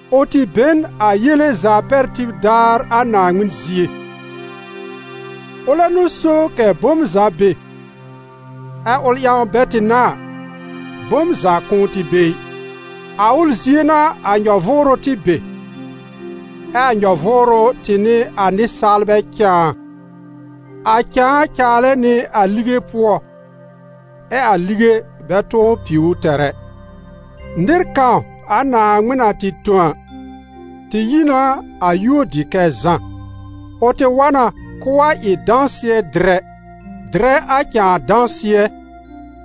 Ʋ tɩ be n a yele za pɛr tib daar a Naaŋmɩn zie. Ʋlɛ n'ʋ so kɛ̀ bom za be, ɛ́ ʋl ƴãw bɛ tɩ n'a a, bom za kʋ̃ʋ tɩ be ɩ. A ʋl zie n'a a nyɔ-vʋʋrʋ tɩ be, ɛ a nyɔ-vʋʋrʋ tɩ n'ɩ a nɩsaalbɛ cãa. A cãa caalɛ nɩ a lige pʋɔ, ɛ a lige bɛ tʋ̃ɔ piw ʋ tɛr ɛ. Nɩr kãw a Naaŋmɩn na tɩ tõ a, tɩ yi na a yúor dɩ kɛ Zã. Ʋ tɩ wa na k'ʋʋ wa ɩ dãsɩɛ-dɩrɛ, dɩrɛ a cãa dãsɩɛ,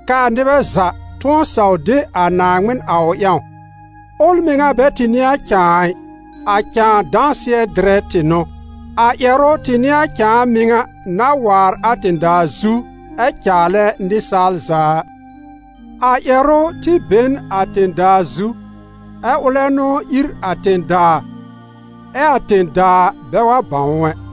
kɛ́ a nɩbɛ za tʋ̃ɔ saw de a Naaŋmɩn a ʋ ƴãw. Ʋl mɩŋa bɛ tɩ n'ɩ a cãa ɩ: a cãa dãsɩɛ-dɩrɛ tɩ n'ʋ. A Ƴɛrʋ tɩ n'ɩ a cãa mɩŋa na waar a tẽ-daa zu ɛ caalɛ nɩsaal za a. A Ƴɛrʋ tɩ be n a tẽ-daa zu, ɛ ʋlɛ n'ʋ ír a tẽ-daa, ɛ a tẽ-daa bɛ wa bãw ʋ ɛ.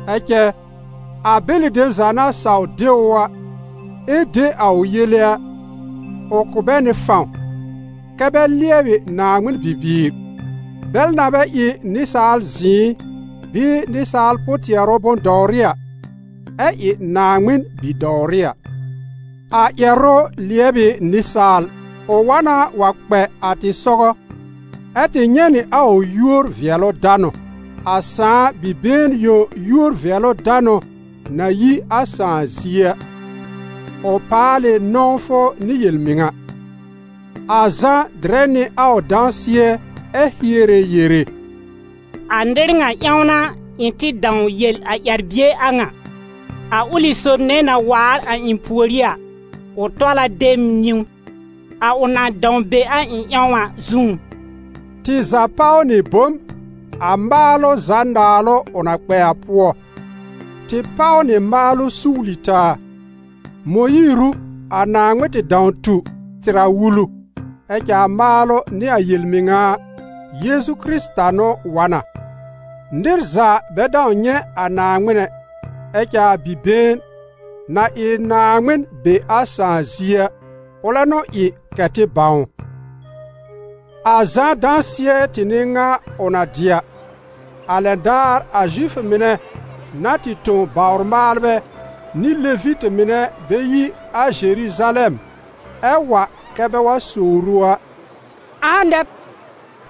Ɛ cɛ, a bɛlɩ dem za na saw de ʋ a, ɛ de a ʋ yele a, ʋ kʋ̀ bɛ nɩ fãw kɛ́ bɛ lɩɛbɩ Naaŋmɩn bibiir, bɛl na bɛ ɩ nɩsaal zɩ̃ɩ bɩɩ nɩsaal pʋ-tɩɛrʋ bʋ̃-dɔwrɩ a, ɛ ɩ Naaŋmɩn bi-dɔwrɩ a. A Ƴɛrʋ lɩɛb ɩ nɩsaal, ʋ wa na wa kpɛ a tɩ sɔgɔ, ɛ tɩ nyɛ̃ nɩ a ʋ yúor-vɩɛlʋ-danʋ, a Sãà Bi-been yõ yúor-vɩɛlʋ-danʋ na yi a Sãà zie a, ʋ paal ɩ nɔ̃wfʋ nɩ yel-mɩŋa. A Zã dɩrɛ nɩ a ʋ dãsɩɛ, ɛ hiere yere: «A nɩr ŋa ƴãw n'a ɩ̃ tɩ dãw yel a ƴɛr-bie a ŋa: ‹A ʋlɩ sob nɛ na waar a ɩ̃ pùorí a, ʋ tɔl a de m niwn, a ʋ na dãw be a ɩ̃ ƴãw a zũú.›» Tɩ za páw nɩ bom a maalʋ za naalʋ ʋ na kpɛ a pʋɔ; tɩ páw nɩ maalʋ suwli taa. Mõyiir ʋ a Naaŋmɩn tɩ dãw tu tɩr a wulu, ɛ cɛ a maalʋ nɩ a yel-mɩŋa a, Yeezu gi Kɩrɩta n'ʋ wa n a. Nɩr za bɛ dãw nyɛ̃ a Naaŋmɩn ɛ, ɛ cɛ a Bi-been, na ɩ Naaŋmɩn be a Sãà zie a, ʋlɛ n'ʋ ɩ kɛ tɩ bãw ʋ. A Zã dãsɩɛ tɩ n'ɩ ŋa ʋ na dɩ a, a lɛn daar a Zifʋ mɩnɛ na tɩ tõ bawr-maalbɛ nɩ Levitɩ mɩnɛ bɛ yi a Zeruzalɛm ɛ wa kɛ́ bɛ wa sowr ʋ a: «Ãa nɛ b?»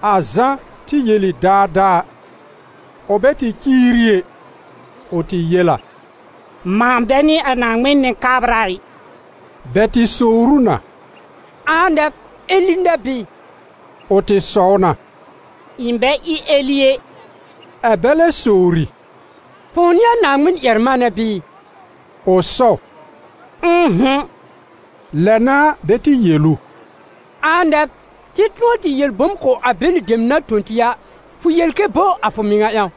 A Zã tɩ yel ɩ daadaa, ʋ bɛ tɩ ciiri ɛ, ʋ tɩ yel a: «Mãa bɛ n'ɩ a Naaŋmɩn Nɩ-kabra ɩ.» Bɛ tɩ sowr ʋ na: «Ãa nɛ b? Eli nɛ b bɩɩ?» Ʋ tɩ sɔw na «Ɩ̃ bɛ ɩ Eli ɛ.» Ɛ bɛ lɛ sowri: «Fʋ̃ʋ n'ɩ a Naaŋmɩn-ƴɛr-manɛ bɩɩ?» Ʋ sɔw: «Ʋ̃ʋ'hʋ̃.» Lɛ n'a bɛ tɩ yel ʋ: «Ãa nɛ b? Tɩ tʋ̃ɔ tɩ yel bom kʋ̀ a bɛlɩ dem na tõ tɩ a, fʋ yel kɛ bo a fʋ mɩŋa ƴãw?»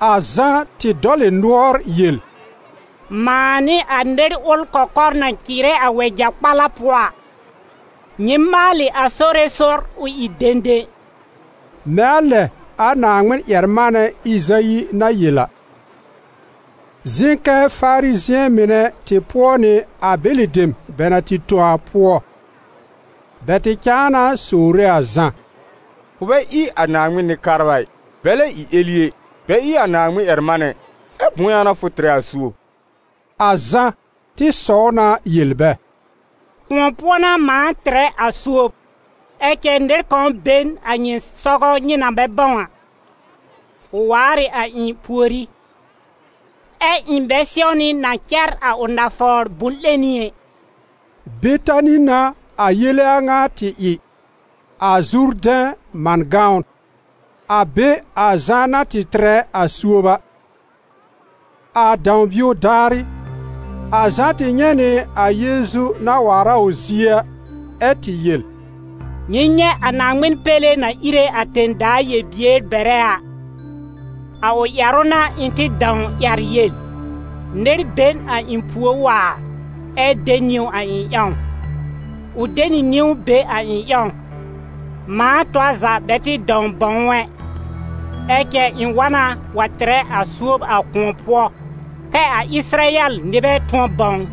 A Zã tɩ dɔl ɩ nʋɔr yel: «Mãa n'ɩ a ‹Nɩr ʋl kɔkɔr na cɩɩrɛ a wɛja-kpalɛ pʋɔ a: Nyɩ maalɩ a Sore sɔr ʋ ɩ dẽdẽ›», mɛ̃ a lɛ a Naaŋmɩn-ƴɛr-manɛ Ɩzayi na yel a. Zɩ̃ kɛ Farizɩ̃ɛ mɩnɛ tɩ pʋɔ nɩ a bɛlɩ dem bɛ na tɩ tõ a pʋɔ. Bɛ tɩ cãa na sowre a Zã: «Fʋ bɛ ɩ a Naaŋmɩn Nɩ-kabra ɩ, bɛ lɛ ɩ Eli ɛ, bɛ ɩ a Naaŋmɩn-ƴɛr-manɛ ɩ, ɛ bʋ̃ʋ ƴãw n'a fʋ tɩrɛ a suob?» A Zã tɩ sɔw na yel bɛ: «Kʋ̃ɔ pʋɔ n'a mãa tɩrɛ a suob; ɛ cɛ nɩr kãw be n a nyɩ sɔgɔ nyɩ na bɛ bãw a. Ʋ waar ɩ a ɩ̃ pùorí, ɛ ɩ̃ bɛ sɛwnɩ na cɛr a ʋ nafawr bʋ̃-'lẽni ɛ.» Betani n'a a yele a ŋa tɩ ɩ, a Zurdɛ̃ man gãwn, a be a Zã na tɩ tɩrɛ a suob a. A dãw-bio daarɩ, a Zã tɩ nyɛ̃ nɩ a Yeezu na waar a ʋ zie a, ɛ tɩ yel: «Nyɩ nyɛ̃ a Naaŋmɩn péle na íre a tẽ-daa yel-bier bɛrɛ a. A ʋ ƴɛrʋ n'a ɩ̃ tɩ dãw ƴɛr yel: ‹Nɩr be n a ɩ̃ púor waar, ɛ de niwn a ɩ̃ ƴãw: ʋ de nɩ niwn be a ɩ̃ ƴãw.› Mãa tɔr za bɛ tɩ dãw bãw ʋ ɛ. Ɛ cɛ ɩ̃ wa na wa tɩrɛ a suob a kʋ̃ɔ pʋɔ, kɛ a Ɩsɩrayɛl nɩbɛ tʋ̃ɔ bãw ʋ.»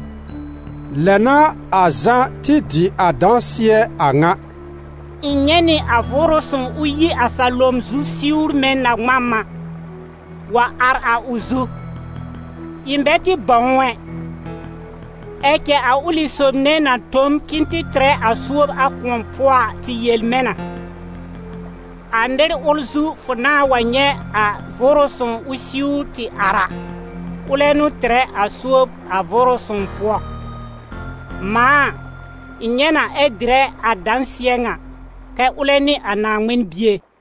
Lɛ n'a a Zã tɩ dɩ a dãsɩɛ a ŋa: «Ɩ̃ nyɛ̃ nɩ a Vʋʋrʋ Sõw ʋ yi a salom zu siwr mɛ̃ na-ŋmam a, wa ar a ʋ zu. Ɩ̃ bɛ tɩ bãw ʋ ɛ, ɛ cɛ a ʋlɩ sob nɛ na tõ m k'ɩ̃ɩ tɩ tɩrɛ a suob a kʋ̃ɔ pʋɔ a tɩ yel mɛ̃ na: ‹A nɩr ʋl zu fʋ nãa wa nyɛ̃ a Vʋʋrʋ Sõw ʋ siwr tɩ ar a, ʋlɛ n'ʋ tɩrɛ a suob a Vʋʋrʋ Sõw pʋɔ›. Mãa a, ɩ̃ nyɛ̃ na ɛ dɩrɛ a dãsɩɛ ŋa, kɛ ʋlɛ n'ɩ a Naaŋmɩn Bie.»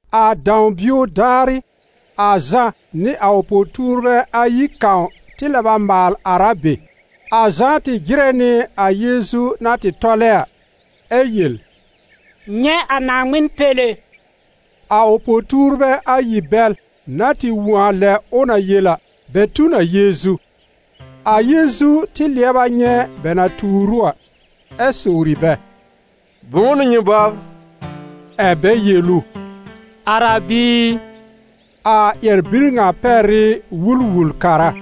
A dãw-bio daarɩ, a Zã nɩ a ʋ po-tuurbɛ ayi kãw tɩ lɛb a maal ar a be. A Zã tɩ jɩrɛ nɩ a Yeezu na tɩ tɔlɛ a, ɛ yel: «Nyɛ̃ a Naaŋmɩn péle.» A ʋ po-tuurbɛ ayi bɛl na tɩ wõ a lɛ ʋ na yel a, bɛ tu n a Yeezu. A Yeezu tɩ lɩɛb a nyɛ̃ bɛ na tuur ʋ a, ɛ sowri bɛ: «Bʋ̃ʋ n'ʋ nyɩ bɔbr?» Ɛ̀ bɛ yel ʋ: «Arabi i, -a ƴɛr-bir ŋa pɛr ɩ Wul-wul-kara-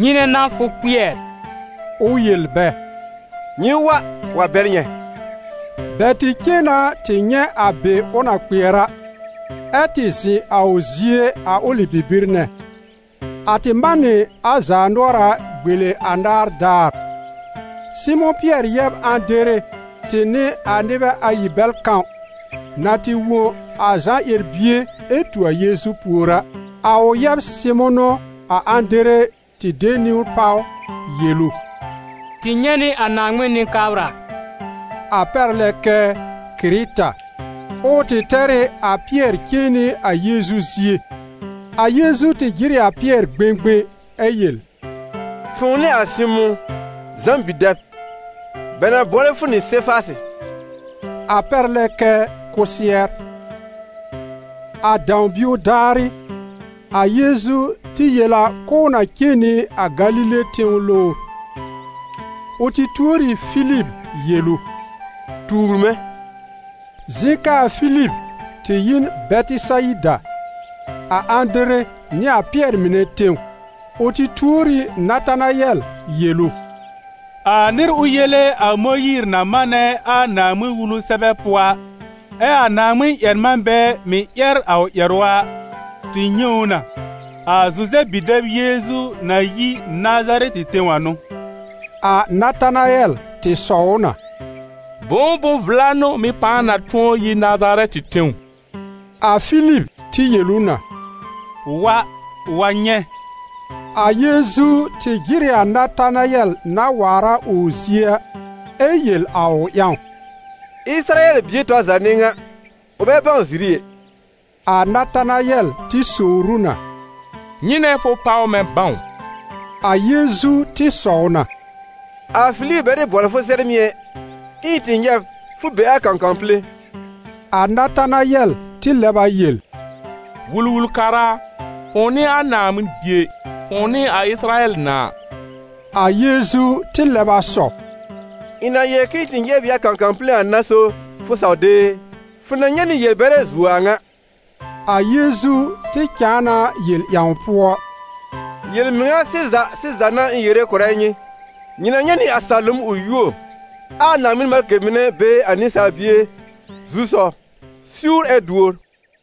nyɩnɛ n'a fʋ kpɩɛr?» Ʋ yel bɛ: «Nyɩ wa wa bɛl nyɛ̃.» Bɛ tɩ cen na tɩ nyɛ̃ a be ʋ na kpɩɛr a, ɛ tɩ zɩ̃ a ʋ zie a ʋlɩ bibir nɛ. A tɩ man nɩ a zaanʋɔra gbele anaar daar. Sɩmʋ̃ Pɩɛr yɛb Ãdere tɩ n'ɩ a nɩbɛ ayi bɛl kãw, na tɩ wõ a Zã ƴɛr-bie ɛ tu a Yeezu pùor a. A ʋ yɛb Sɩmʋ̃ n'ʋ a Ãdere tɩ de niwn páw, yel ʋ: «Tɩ nyɛ̃ nɩ a Naaŋmɩn Nɩ-kabra», a pɛr lɛ kɛ: Kɩrɩta. Ɛ ʋ tɩ tɛr ɩ a Pɩɛr cen nɩ a Yeezu zie. A Yeezu tɩ jɩr ɩ a Pɩɛr gbẽgbẽ ɛ yel: «Fʋ̃ʋ n'ɩ a Sɩmʋ̃, Zã bi-dɛb, bɛ na bʋɔlɛ fʋ nɩ Sefasɩ», a pɛr lɛ kɛ: Kʋsɩɛr. A dãw-bio daarɩ, a Yeezu tɩ yel a k'ʋʋ na cen nɩ a Galile tẽw lowr. Ʋ tɩ tuor ɩ Filib yel ʋ: «Tuur mɛ̃!» Zɩ̃ kɛ a Filib tɩ yi n Bɛtɩsayida, a Ãdere nɩ a Pɩɛr mɩnɛ tẽw. Ʋ tɩ tuor ɩ Natanayɛl yel ʋ: «A nɩr ʋl yele a Mõyiir na manɛ a Naaŋmɩn-Wulu sɛbɛ pʋɔ a, ɛ a Naaŋmɩn-ƴɛr-manbɛ mɩ̀ ƴɛr a ʋ ƴɛrʋ a, tɩ nyɛ̃ ʋ na, a Zuzɛb bi-dɛb Yeezu na yi Nazarɛtɩ tẽw a n'ʋ.» A Natanayɛl tɩ sɔw ʋ na: «Bʋ̃ʋ bʋ̃-vla n'ʋ mɩ́ pãa na tʋ̃ɔ yi Nazarɛtɩ tẽw?» A Filib tɩ yel ʋ na: «Wa, wa nyɛ̃.» A Yeezu tɩ jɩr ɩ a Natanayɛl na waar a ʋ zie a, ɛ yel a ʋ ƴãw: «Ɩsɩrayɛl bie tɔr za n'ɩ ŋa, ʋ bɛ bãw ziri ɛ.» A Natanayɛl tɩ sowr ʋ na: «Nyɩnɛ fʋ páw mɛ̃ bãw?» A Yeezu tɩ sɔw na: «A Filib bɛ tɩ bʋɔlɩ fʋ sɛr mɩ̀ ɛ, ɛ ɩ̃ tɩ nyɛ̃ b fʋ be a kãkãw pile!» A Natanayɛl tɩ lɛb a yel: «Wul-wul-kara a, fʋ̃ʋ n'ɩ a Naaŋmɩn Bie, fʋ̃ʋ n'ɩ a Ɩsɩrayɛl Nãà!» A Yeezu tɩ lɛb a sɔw: «Ɩ̃ na yel k'ɩ̃ɩ tɩ nyɛ̃ b ɩ a kãkãw pile a n'a so fʋ saw de e? Fʋ na nyɛ̃ nɩ yel-bɛrɛ zuo a ŋa!» A Yeezu tɩ cãa na yel ƴãw pʋɔ: «Yel-mɩŋa sɩza sɩza n'a ɩ̃ yere kʋ̀rɛ nyɩ, nyɩ na nyɛ̃ nɩ a salom ʋ yuo, ɛ a Naaŋmɩn malkɩ mɩnɛ be a Nɩsaal Bie zu-sɔw siwr ɛ duor.»